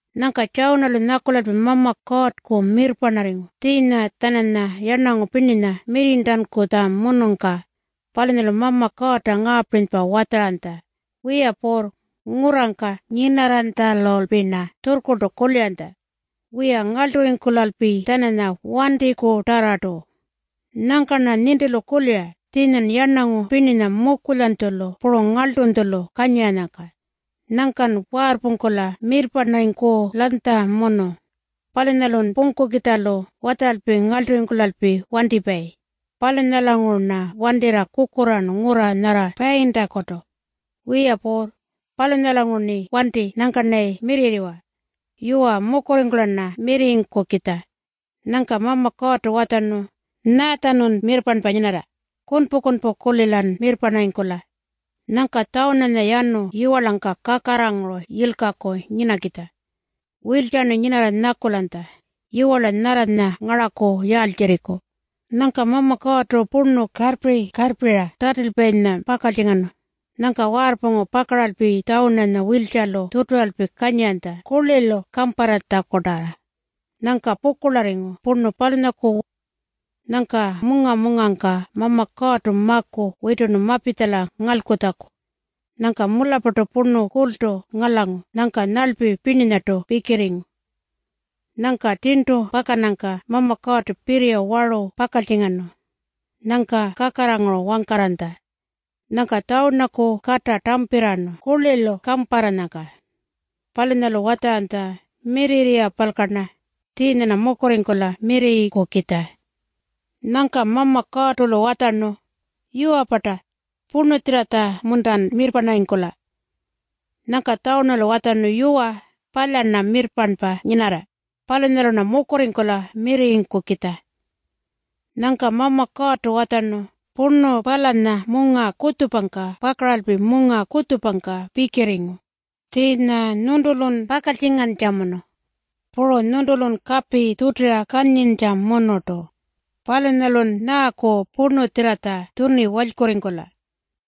Nyangka Tjawunalu nyakulalpi Mama Kuurrku mirrparnarringu tjiinya-tjananya yarnangu pirninya mirrirntankutjamunungka. Palunyalu Mama Kuurrta ngaapirinypa watjaranytja, “Wiya Puurr, ngurrangka nyinarranytjalulpi-rna tjurrkurltu kuliranytja, ‘Wiya, ngarlturringkulalpi-tjananya wantikutarrartu.’ Nyangka-rna nintilu kulira tjiinyan yarnangu pirninya mukulyanytjulu puru ngarltunytjulu kanyiranyangka. Nyangkan waarrpungkula mirrparnarringkulanytjamunu. Palunyalun pungkukitjalu watjaralpi ngarlturringkulalpi wantipayi. Palunyalanguru-rna wantirra kukurraarnu ngurra nyarra Payintakutu. Wiya Puurr, palunyanguru-rni wanti nyangka-rnayi mirrirriwa. Yuwa, mukurringkula-rna mirrirringkukitja.” Nyangka Mama Kuurrtu watjarnu, “Nyaatjanun mirrparnpa nyinarra? Kunpu-kunpu-kulilan mirrparnarringkula.” Nyangka Tjawunanya yanu yiwarlangka kakarraranguru yilkaku nyinakitja. Wiltjarnu nyinarra nyakulanytja, “Yiwarla nyarranya ngaraku yaaltjirriku?” Nyangka Mama Kuurrtu purnu karrpi-karrpira tatilpayinya pakaltjingarnu. Nyangka waarrpungu pakaralpi Tjawunanya wiltjalu tjuturalpi kanyiranytja kurlilu kamparratjakutarra. Nyangka pukurlarringu purnu palunyaku. Nyangka munga-mungangka Mama Kuurrtu maku witurnu mapitjala ngalkutjaku. Nyangka mularrpartu purnu kultu ngalangu nyangka nyarlpi pirninyartu pikirringu. Nyangka tjirntu pakannyangka Mama Kuurrtu pirriya waru pakaltjingarnu. Nyangka kakarraranguru wangkarranytja. Nyangka Tjawunaku kata tampirraarnu kurlilu kamparranyangka. Palunyalu watjaranytja, “Mirrirriwapalka-rna. Tjiinya-rna mukurringkula mirrirringkukitja.” Nyangka Mama Kuurrtu-lu watjarnu, “Yuwa-parta? Purnutjirratja-muntan mirrparnarringkula?” Nyangka Tjawunalu watjarnu, “Yuwa, palya-rna mirrparnpa nyinarra. Palunyalu-rna mukurringkula mirrirringkukitja.” Nyangka Mama Kuurrtu watjarnu, “Purnu palanya munga kutjupangka pakaralpi munga kutjupangka pikirringu. Tjiinya nyuntulun pakaltjingantjamunu. Puru nyuntulun kapi tjutira kanyintjamunurtu. Palunyalun nyaaku purnutjirratja tjuni walykurringkula?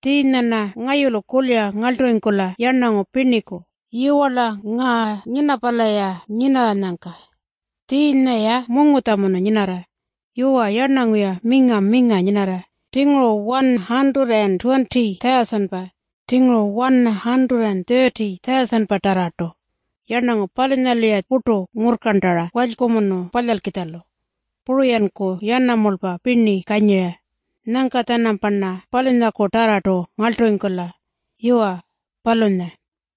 Tjiinya-rna ngayulu kulira ngarlturringkula yarnangu pirniku, yiwarla ngaa Ninapala-ya nyinarranyangka. Tjiinya-ya mungutjamunu nyinarra. Yuwa, yarnangu-ya minga-minga nyinarra, tjinguru 120,000-pa, tjinguru 130,000-patarrartu. Yarnangu palunyalu-ya purtu ngurrkarntara walykumunu palyalkitjalu. Puru-yanku yanamulpa pirni kanyira. Nyangka-tjanamparna palunyakutarrartu ngarlturringkula.” Yuwa, palunya.